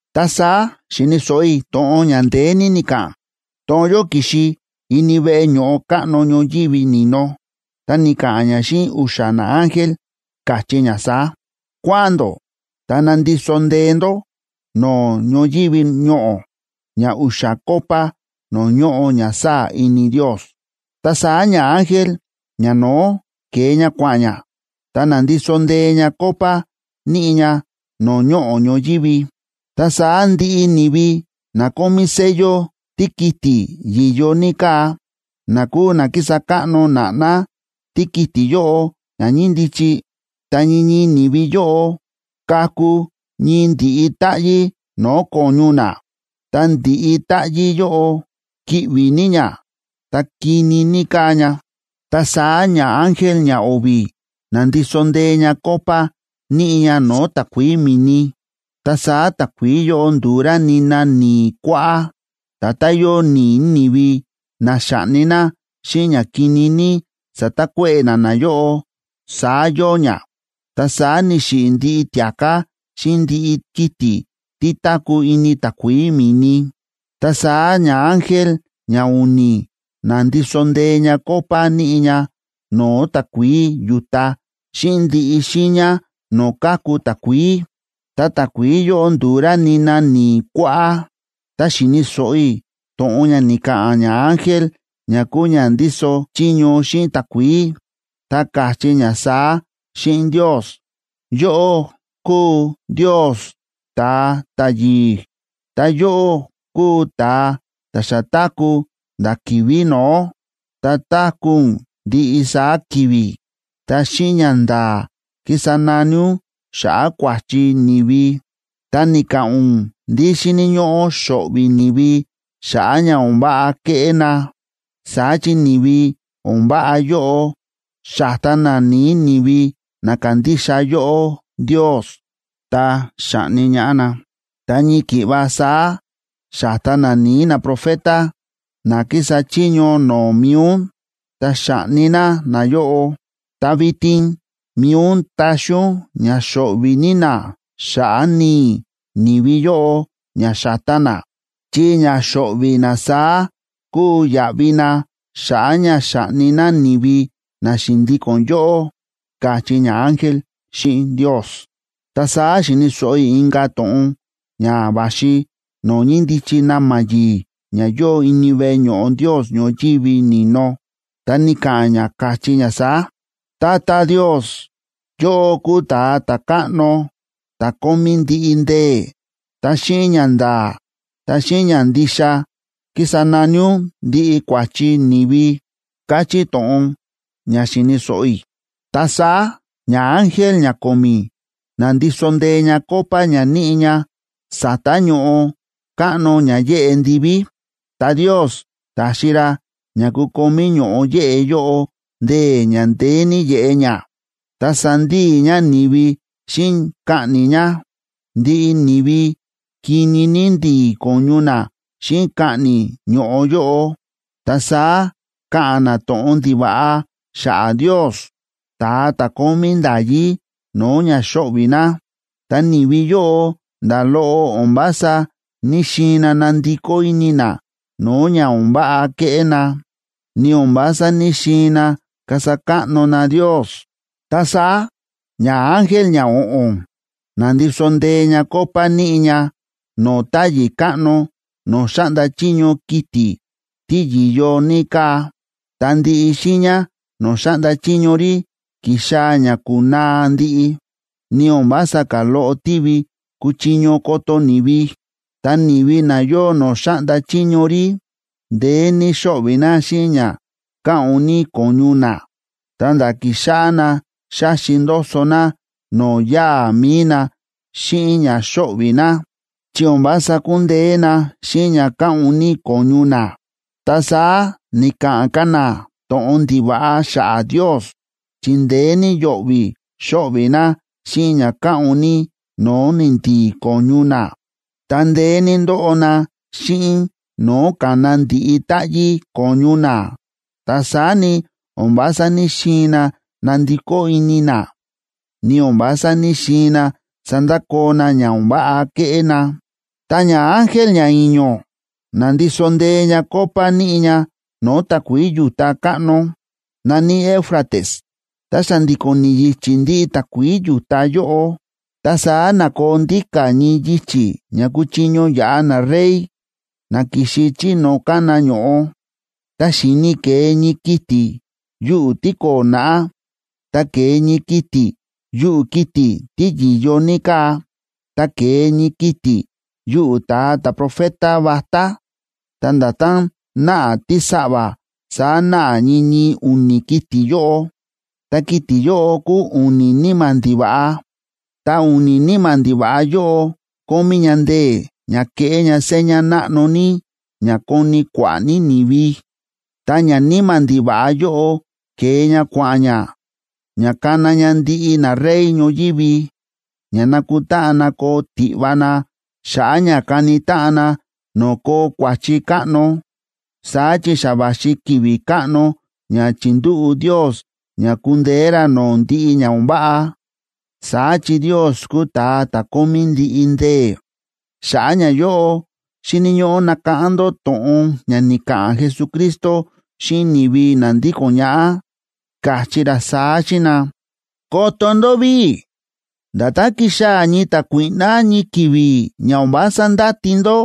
Ta saá xi̱ni̱ so̱ꞌo i̱ to̱ꞌon ña ndeé ní ni̱ka̱ꞌa̱n. To̱ꞌon yóꞌo ki̱xi ini veꞌe ño̱ꞌo káꞌno ñoyívi ni̱no, ta ni̱ka̱ꞌa̱n ña xíꞌin u̱xa̱ naángel, káchí ña saá: ―Kua̱ꞌa̱n ndó ta nandiso ndée ndó no̱o̱ ñoyívi ñoꞌo̱ ña u̱xa̱ copa no̱o̱ ñóꞌo ña sáa̱ ini Ndios. Ta saá ñaángel ñano̱ó ke̱e ña kua̱ꞌa̱n ña, ta na̱ndiso ndée ña copa níꞌi ña no̱o̱ ñoꞌo̱ ñoyívi. Ta saá ndiꞌi ni̱vi na kómí sello tíkiti̱ yi̱yo ní káa, na kúu na ki̱sa káꞌno na̱ꞌná tíkiti̱ yóꞌo ña ñíndichi, ta ñii ñii ni̱vi yóꞌo, ka̱ku ñii ndi̱ꞌi táꞌyí no̱o̱ ko̱ñu na. Ta ndi̱ꞌi táꞌyí yóꞌo kíꞌvi̱ ní ña, ta kini ní káa ña. Ta saá ñaángel ñao̱vi̱ na̱ndiso ndée ña copa níꞌi ña no̱o̱ takuií mi̱ni. Ta saá takuií yóꞌo ndu̱u rá nina ni̱i̱ kuáꞌá. Nda̱tán yóo ni̱i̱ ni̱vi na xa̱ꞌni na xíꞌin ña kini ní sa̱takuéꞌe̱ na nayóꞌo, saá yóo ña. Ta saá ni̱xiꞌi̱ ndiꞌi tia̱ká xíꞌin ndiꞌi kiti̱ tí táku̱ ini takuií mi̱ni. Ta saá ñaángel ñau̱ni̱ na̱ndiso ndée ña copa níꞌi ña no̱o̱ takuií yu̱ta xíꞌin ndiꞌi xiiña no̱o̱ káku takuií, ta takuií yóꞌo ndu̱u rá nina ni̱i̱ kuáꞌá. Ta xi̱ni̱ so̱ꞌo i̱ to̱ꞌon ña ni̱ka̱ꞌa̱n ñaángel ña kúu ña ndíso chiño xíꞌin takuií, ta káchí ña saá xíꞌin Ndios: ―Yóꞌó kúu Ndios ta̱a ta̱yi̱i̱, ta yóꞌó kúu ta̱a ta̱ xa táku̱ a̱nda̱ ki̱vi̱ no̱ó, ta táku̱ ún ndiꞌi saá ki̱vi̱. Ta xíꞌin ñanda̱a̱ ki̱sa nani ún xa̱ꞌa̱ kua̱chi ni̱vi, ta ni̱ka̱ꞌa̱n ún ndí xíni̱ ñóꞌó xo̱ꞌvi̱ ni̱vi xa̱ꞌa̱ ña o̱n váꞌa ke̱ꞌé na. Saá chi ni̱vi o̱n váꞌa yóꞌo, xa̱ta na ni̱i̱ ni̱vi na kándixa yóꞌó Ndios, ta xa̱ꞌni ñaꞌá na. Ta ñii ki̱ꞌva saá xa̱ta na ni̱i̱ naprofeta na ki̱sa chiño no̱o̱ mi̱i ún, ta xa̱ꞌni na nayóꞌo. Ta vitin mi̱i ún táxi ún ña xo̱ꞌvi̱ ní na xa̱ꞌa̱ ni̱i̱ ni̱vi yóꞌo ña xa̱ta na, chi ña xo̱ꞌvi̱ na saá kúu yaꞌvi na xa̱ꞌa̱ ña xa̱ꞌni na ni̱vi na xi̱ndíko̱n yóꞌó ―káchí ñaángel xíꞌin Ndios. Ta saá xi̱ni̱ so̱ꞌo i̱ inka̱ to̱ꞌon ña va̱xi no̱o̱ ñíndichi na̱ma̱ yi̱i̱ ña yóo ini veꞌe ño̱ꞌo Ndios ñoyívi ni̱no. Ta ni̱ka̱ꞌa̱n ña káchí ña saá: ―Tata Ndios, yóꞌó kúu Ta̱a Ta̱káꞌno ta̱ kómí ndiꞌi ndee̱. Ta xíꞌin ñanda̱a̱, ta xíꞌin ñandixa kísa nani ún ndiꞌi kua̱chi ni̱vi ―káchí to̱ꞌon ña xi̱ni̱ so̱ꞌo i̱. Ta saá ñaángel ñako̱mi̱ na̱ndiso ndée ña copa ña níꞌi ña sa̱ta̱ ño̱ꞌo káꞌno ña yéꞌe ndiví. Ta Ndios ta̱xi ra ña kukomí ño̱ꞌo yéꞌe yóꞌo ndee̱ ña ndeé ní yeꞌe ña, ta sandíi ña ni̱vi xíꞌin kaꞌni̱ ña. Ndiꞌi ni̱vi kini ní ndi̱i̱ ko̱ñu na xíꞌin kaꞌni̱ ño̱ꞌo yóꞌo. Ta saá ka̱ꞌa̱n na to̱ꞌon ndiva̱ꞌa xa̱ꞌa̱ Ndios, ta̱a ta̱ kómí nda̱yí no̱o̱ ña xóꞌvi̱ na. Ta ni̱vi yóꞌo nda̱ loꞌo o̱n vása ní‑xiin na nandikó ini na no̱o̱ ña o̱n váꞌa kéꞌé na, ni o̱n vása ní‑xiin na kasa káꞌno na Ndios. Ta saá ñaángel ñao̱ꞌo̱n na̱ndiso ndée ña copa níꞌi ña no̱o̱ táyi̱ káꞌno no̱o̱ xáꞌnda chiño kiti̱ tí yi̱yo ní káa. Ta ndiꞌi xiiña no̱o̱ xáꞌnda chiño rí ki̱xaa̱ ña ku̱naa ndiꞌi, ni o̱n vása ka̱ loꞌo tívi kuchiño koto ni̱vi. Ta ni̱vi na yóo no̱o̱ xáꞌnda chiño rí, ndeé ní xóꞌvi̱ na xíꞌin ña káꞌu̱n ní ko̱ñu na, ta̱nda̱ ki̱xáꞌá na xáxi ndoso na no̱o̱ yáa̱ mi̱i na xíꞌin ña xóꞌvi̱ na, chi o̱n vása kúndeé na xíꞌin ña káꞌu̱n ní ko̱ñu na. Ta saá ni̱ka̱ꞌa̱n ka̱ na to̱ꞌon ndiva̱ꞌa xa̱ꞌa̱ Ndios, chi ndeé ní yo̱ꞌvi̱ xóꞌvi̱ na xíꞌin ña káꞌu̱n ní no̱o̱ ni̱ndi̱i̱ ko̱ñu na, ta ndeé ní ndóꞌo na xíꞌin no̱o̱ ka̱na ndi̱ꞌi táꞌyí ko̱ñu na. Ta saá ni, o̱n vása ní‑xiin na nandikó ini na, ni o̱n vása ní‑xiin na sandakoo na ña o̱n váꞌa kéꞌé na. Ta ñaángel ñai̱ño̱ na̱ndiso ndée ña copa níꞌi ña no̱o̱ takuií yu̱ta káꞌno, na̱ní Éufrates, ta xa̱ndi̱ko̱n ni̱yi̱chi̱ ndiꞌi takuií yu̱ta yóꞌo. Ta saá na̱koo ndíka̱ ñii yichi̱ ña kuchiño yaꞌa narey, na ki̱xi chí no̱o̱ kána ño̱ꞌo. Ta xi̱ni i̱ ke̱e ñii kiti̱ yuꞌu̱ tíko̱o̱ naꞌá, ta ke̱e ñii kiti̱ yuꞌu̱ kiti̱ tí yi̱yo ní káa, ta ke̱e ñii kiti̱ yuꞌu̱ ta̱a ta̱profeta vatá. Ta nda̱tán náꞌa tísaꞌva̱, saá náꞌa ñii ñii u̱ni̱ kiti̱ yóꞌo. Ta kiti̱ yóꞌo kúu u̱ni̱ níma̱ ndiva̱ꞌa. Ta u̱ni̱ níma̱ ndiva̱ꞌa yóꞌo kómí ña ndee̱ ña keꞌé ña seña náꞌno ní ña koni kua̱ꞌa̱ ní ni̱vi. Ta ñaníma̱ ndiva̱ꞌa yóꞌo, ke̱e ña kua̱ꞌa̱n ña ña kana ña ndiꞌi narey ñoyívi, ña nakutáꞌan na koo tiꞌva na xa̱ꞌa̱ ña kani táꞌan na no̱o̱ koo kua̱chi káꞌno. Saá chi xa va̱xi ki̱vi̱ káꞌno ña chi̱ndúꞌu̱ Ndios ña kundeé ra no̱o̱ ndiꞌi ña o̱n váꞌa. Saá chi Ndios kúu ta̱a ta̱ kómí ndiꞌi ndee̱. Xa̱ꞌa̱ ñayóꞌo xíni̱ ñóꞌó nakáꞌán ndó to̱ꞌon ña ni̱ka̱ꞌa̱n Jesucristo xíꞌin ni̱vi na ndíko̱n ñaꞌá, káchí ra saá xíꞌin na: “¡Koto ndó ví! Nda̱tán kixaa̱ ñii ta̱kuíꞌná ñii ki̱vi̱ ña o̱n vása ndáti ndó,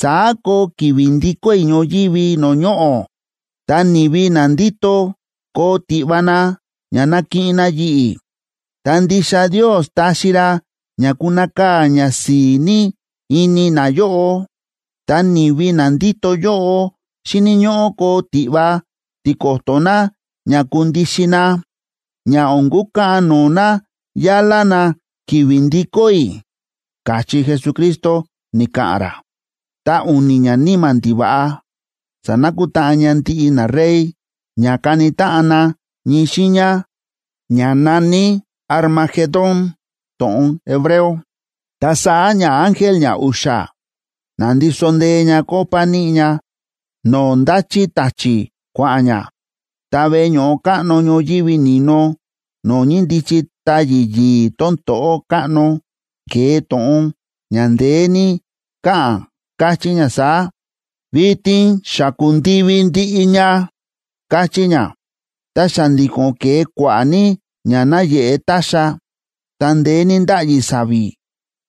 saá koo ki̱vi̱ ndikó i̱ ñoyívi no̱o̱ ñoꞌo̱. Ta ni̱vi na ndíto koo tiꞌva na ña nakiꞌin na yi̱ꞌi̱, ta ndixa Ndios taxi ra ña kunakaa̱ ñasi̱i̱ ní ini nayóꞌo. Ta ni̱vi na ndíto yóꞌo xíni̱ ñóꞌó koo tiꞌva tiko̱to̱ na ña kundixin na, ña o̱n kukaꞌan no̱o̱ na yálá na ki̱vi̱ ndikó i̱”, káchí Jesucristo, ni̱ka̱ꞌa̱n ra. Ta u̱ni̱ ñaníma̱ ndiva̱ꞌa sa̱nakutáꞌan ña ndiꞌi narey ña kani táꞌan na ñii xiiña ña na̱ní Armagedón, to̱ꞌon hebreo. Ta saá ñaángel ñau̱xa̱ na̱ndiso ndée ña copa níꞌi ña no̱o̱ ndáchí ta̱chi̱ kua̱ꞌa̱n ña. Ta veꞌe ño̱ꞌo káꞌno ñoyívi ni̱no no̱o̱ ñíndichi táyi̱ yi̱i̱ tón to̱ꞌó káꞌno, ke̱e to̱ꞌon ña ndeé ní káꞌa̱n, káchí ña saá: ―¡Vitin xa ku̱ndivi ndiꞌi ña! ―káchí ña. Ta xa̱ndi̱ko̱n ke̱e kua̱ꞌa̱ ní ña náyeꞌe ta̱xa̱, ta ndeé ní ndáꞌyi sa̱vi̱,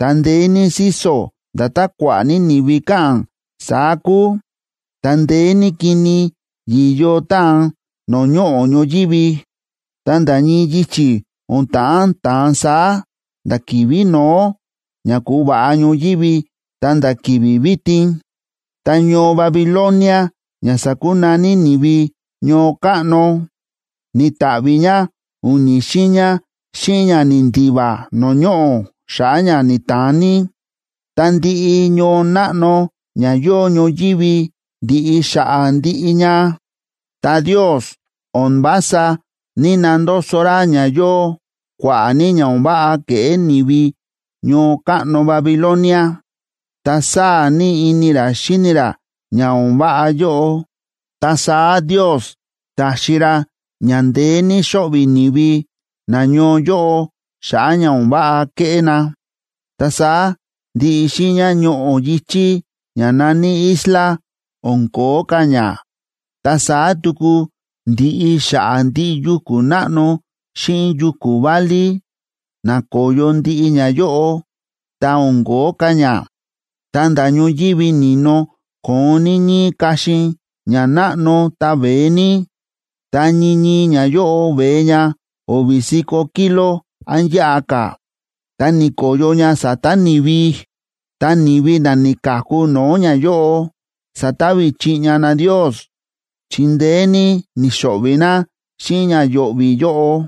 ta ndeé ní síso̱ nda̱tán kua̱ꞌa̱ ní ni̱vi káꞌa̱n, saá kúu. Ta ndeé ní kini yi̱yo táan no̱o̱ ñoꞌo̱ ñoyívi, ta nda̱ ñii yichi̱ o̱n ta̱ꞌán ta̱an saá nda̱ ki̱vi̱ no̱ó ña ku̱va̱ꞌa ñoyívi ta̱nda̱ ki̱vi̱ vitin. Ta ñoo Babilonia ña sa̱kunaní ni̱vi “ñoo káꞌno” ni̱ta̱ꞌvi̱ ña u̱ni̱ xiiña xíꞌin ña ni̱ndiva no̱o̱ ñoꞌo̱ xa̱ꞌa̱ ña ni̱ta̱an ní. Ta ndiꞌi ñoo náꞌno ña yóo ñoyívi ndiꞌi xa̱ꞌa̱ ndiꞌi ña. Ta Ndios o̱n vása ní‑nandoso ra ña yóo kua̱ꞌa̱ ní ña o̱n váꞌa ke̱ꞌé ni̱vi ñoo káꞌno Babilonia, ta sáa̱ ní ini ra xíni ra ña o̱n váꞌa yóꞌo. Ta saá Ndios ta̱xi ra ña ndeé ní xo̱ꞌvi̱ ni̱vi nañoo yóꞌo xa̱ꞌa̱ ña o̱n váꞌa ke̱ꞌé na. Ta saá ndiꞌi xiiña ñoꞌo̱ yi̱chí ña na̱ní isla, o̱n ko̱ó ka̱ ña. Ta saá tuku ndi̱ꞌi xa̱ꞌa̱ ndiꞌi yuku̱ náꞌno xíꞌin yuku̱ válí, na̱koyo ndiꞌi ñayóꞌo, ta o̱n ko̱ó ka̱ ña. Ta nda̱ ñoyívi ni̱no ko̱on ní ñíí kaxin ña náꞌno ta veé ní, ta ñii ñii ñayóꞌo veé ña o̱vi̱ si̱ko̱ kilo án yáꞌa ka̱. Ta ni̱ko̱yo ña sa̱ta̱ ni̱vi, ta ni̱vi na ni̱ka̱ku no̱o̱ ñayóꞌo, sa̱tavi chiꞌña na Ndios chi ndeé ní ni̱xo̱ꞌvi̱ na xíꞌin ña yo̱ꞌvi̱ yóꞌo.